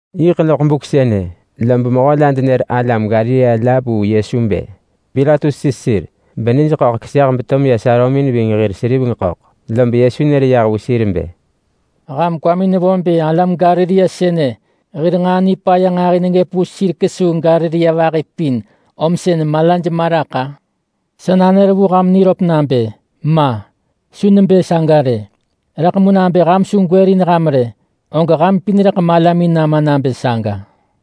Yiḳ loḳ buk sënë, lob mehö la denër alam Galilea la vu Yesu bë Pilatus sis sir benij ḳöḳ keseh beto meya sarömin ving hir seriveng ḳöḳ. Lob Yesu nër yah vu sir bë, “Ham kwamin nevo bë alam Galilea sënë hir nġaa nipaya nġahi neggëp vu sir kesuu Galilea vahi pin om sën malaj ma raḳ-a? Sa nanër vu ham niröp nabë: Ma! Su nebë saga rë! Rëḳ mu nabë ham su gwërin ham rë, og ham pin rëḳ malamin nama nabë saga.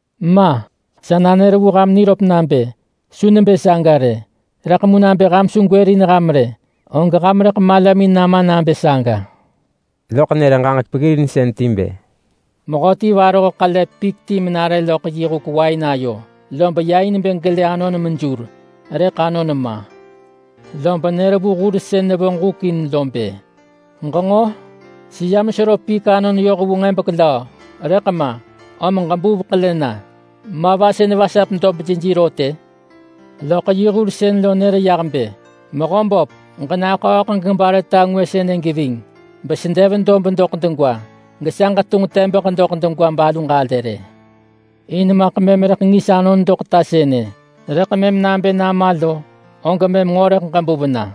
Ma! Sa nanër vu ham niröp nabë: Su nebë saga rë! Rëḳ mu nabë ham su gwërin ham rë, og ham rëḳ malamin nama nabë saga.” Loḳ nër ġaġek peggirinsën ti bë, “Mehöti varoh ḳele pik ti menare loḳ yi huk wain ayo, lob ya in bë gelë anon mejur, rëḳ anon ma. Lob nër vu hur sën nevonġ huk in lo bë, ‘Ġenġo? Seyam sero pik anon yoh vu nġebek löö, rëḳ ma, om ġebuv ḳele na, ma va sën vasap dob jeji rot-ë!’ Loḳ yi hur sën lo nër yah bë, ‘Mehö böp, ġenaḳööḳ ġebare ta ngwë sënë geving, besedev dob doḳ degwa, gesa ġetunġ tebeḳ doḳ degwa balu ġalë rë. In maḳ mëm rëḳ ngis anon doḳ ta sënë. Rëḳ mëm nabë nama lo, og mëm nġo rëḳ ġebuv na.’”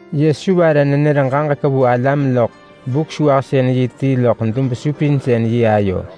Yesu vare nenër ġaġek vu alam loḳ Buk-sewahsën-yi ti loḳ dub-supinsën-yi ayo.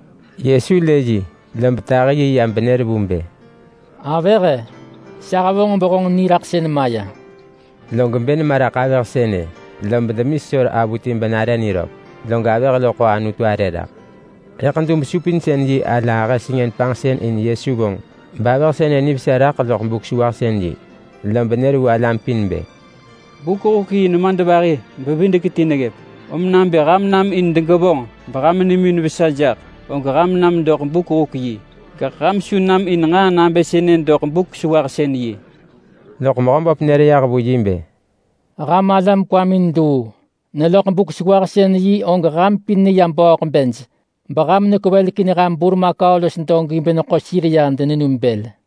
Yesu lë yi, lob tahi yi ya benër vu bë, “Avëh-e, sa hevonġ behonġ niraḳsën maya.” Log bë nema raḳ avëh sënë, lob demi sesor avuti benare niröp. Log avëh lo ḳo Anutu arë raḳ. Rëḳ dub-supinsën-yi ala ahë sengën panġsën in Yesu vonġ bavëh sënë nivesa raḳ loḳ Buk-sewahsën-yi. Lob nër vu alam pin bë, “Buk-huk-yi nemadvahi-bevidek-ti neggëp, om nabë ham nam in degevonġ beham nimin vesa jaḳ, og ham nam doḳ buk-huk-yi, gaḳ ham su nam in nġaa nabë sënë doḳ Buk-sewahsën-yi.” Loḳ Mehöböp nër yah vu yi bë, “Ham alam kwamin luu! Neloḳ Buk-sewahsën-yi og ham pin neya bööḳ bej beham nekwevelekin ham burmakau los dogi beneḳo sir ya denenum bël.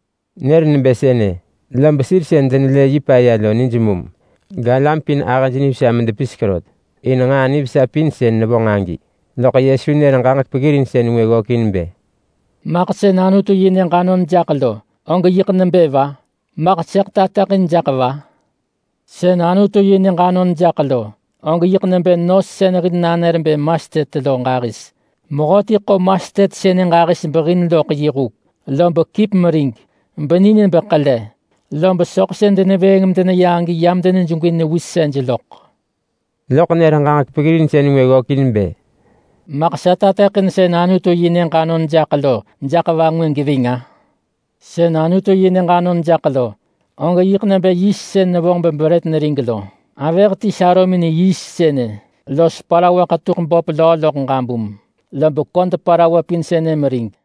Nër nebë sënë, lob sir sën denelë yi paya lo nij mum. Galam pin ahëj nivesa medepisek rot in nġaa nivesa pin sën nevonġ agi. Log Yesu nër ġaġek peggirinsën ngwë ggökin bë, “Maḳ sën Anutu-yi-nyëġ anon jaḳ lo, og yiḳ nebë va? Maḳ sëḳ tateḳin jaḳ va? Sën Anutu-yi-nyëġ anon jaḳ lo, og yiḳ nebë nos sën hil nanër bë mastet lo ġahis. Mehöti ḳo mastet sënë ġahis behin loḳ yi huk. Lob kip merig beni nebë ḳele, lob soḳ sën denevëëng medeneya agi yam denejegwi newisej loḳ.” Loḳ nër ġaġek peggirinsën ngwë ggökin bë, “Maḳ sa tateḳin sën Anutu-yi-nyëġ anon jaḳ lo jaḳ va ngwë geving-a? Sën Anutu-yi-nyëġ anon jaḳ lo, og yiḳ nebë yiist sën nevonġ bebrët nerig lo. Avëh ti sarömin yiist sënë los parawa ḳetuḳ böp löö loḳ ġabum, lob köd parawa pin sënë merig.”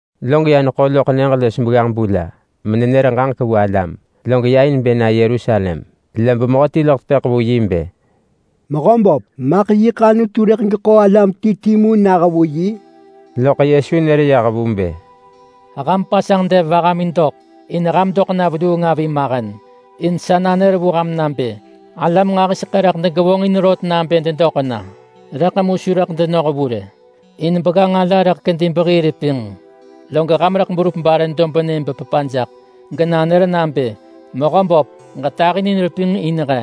Log ya neḳo loḳ nyëġ los begganġ-bu la, menenër ġaġek vu alam, log ya in bë na Yerusalem, lob mehöti loḳ tepëḳ vu yi bë, “Mehöböp, maḳ yiḳ Anutu rëḳ geḳo alam ti ti mu nah vu yi?” Loḳ Yesu nër yah vu bë, “Ham pasanġ dev vahamin doḳ in ham doḳ na veluung avi mahen. In sa nanër vu ham nabë: Alam nġahiseḳë rëḳ degevonġin rot nabë dedoḳ na, rëḳ mu su rëḳ denoh vu rë, in begganġ ala rëḳ kedi bebehii repinġ. Log ham rëḳ berup bare dobnë bepepa jaḳ, genanër nabë, ‘Mehöböp, ġetahinin repinġ in he!’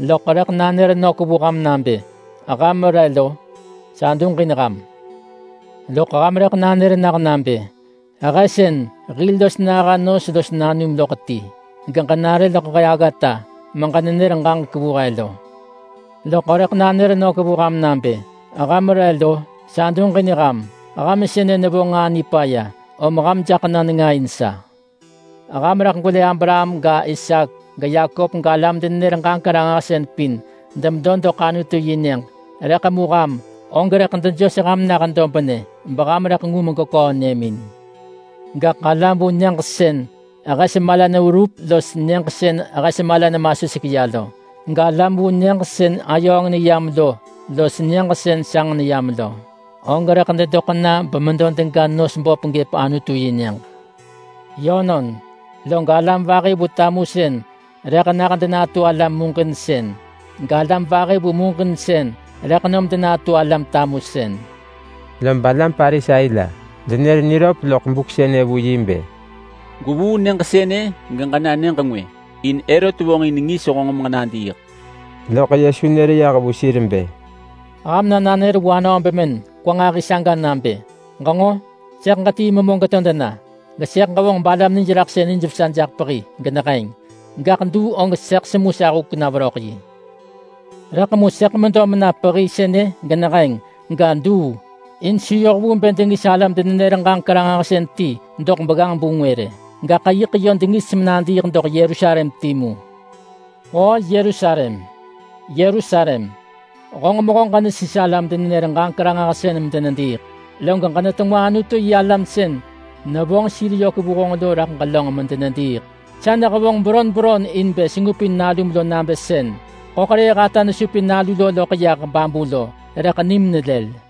Loḳ rëḳ nanër nök vu ham nabë, ‘Ham re lo? Sa duġin ham!’ Loḳ ham rëḳ nanër nah nabë, ‘He sën hil los naha nos los nanum loḳ ti, geġenare loḳ he aggata meġenenër ġaġek vu he lo.’ Loḳ rëḳ nanër vu ham nabë, ‘Ham re lo? Sa duġin ham! Ham sënë nevonġ nġaa nipaya, om ham jaḳ na nenga in sa!’ Ham rëḳ gwelë Abraham ga, Isaak ga, Yakop galam-denenër-ġaġek-ranġahsën pin demedo doḳ Anutu-yi-nyëġ, rëḳ mu ham, og rëḳ dejos ham nah dobnë beham rëḳ ngu megweköö nyëmin. Gaḳ alam vu nyëġ sën hes mala neverup los nyëġ sën hes mala nemasuseḳ ya lo, galam vu nyëġ sën ayööng neyam lo los nyëġ sën sanġ neyam lo, og rëḳ dedoḳ na bemedo dega nos böp gëp Anutu-yi-nyëġ. Yönon, log alam vahi vu tamusën rëḳ nah denatu alam muġinsën. Galam vahi vu muġinsën rëḳ nom denatu alam tamusën.” Lob alam Parisai la denër niröp loḳ buk sënë vu yi bë, “Gwevuu nyëġ sënë geġena nyëġ ngwë, in Herot vonġin ngis honġ meġenadiiḳ.” Loḳ Yesu nër yah vu sir bë, “Ham na nanër vu anöö bemën kwa nġahi saga nabë, ‘Ġenġo! Sëḳ ġetii memö geto dena, gesëḳ ġevonġ balam nijraḳsën nijvesa jaḳ pehi geneheng. Gaḳ duu og sëḳ semu sa huk na veröḳ yi.’ Rëḳ mu sëḳ medo mena pehi sënë geneheng, ga, duu. In su yoh vu bë dengis alam-denenër-ġaġek-ranġahsën ti doḳ begganġ-bu ngwë rë, gaḳ yiḳ yö dengis menadiiḳ doḳ Yerusalem timu. “Oo Yerusalem, Yerusalem, honġ mehö ġenesis alam-denenër-ġaġek-ranġahsën medenediiḳ, geġenetengwa Anutu-yi-alam sën nevonġ sir yök vu honġ lo raḳ ġelönġ medenediiḳ. Sa nehevonġ beron beron in bë sengupin nalum lo nabë sën ḳöḳrëëh ata nesupin nalu lo loḳ yah babu lo, rëḳ nim nelël.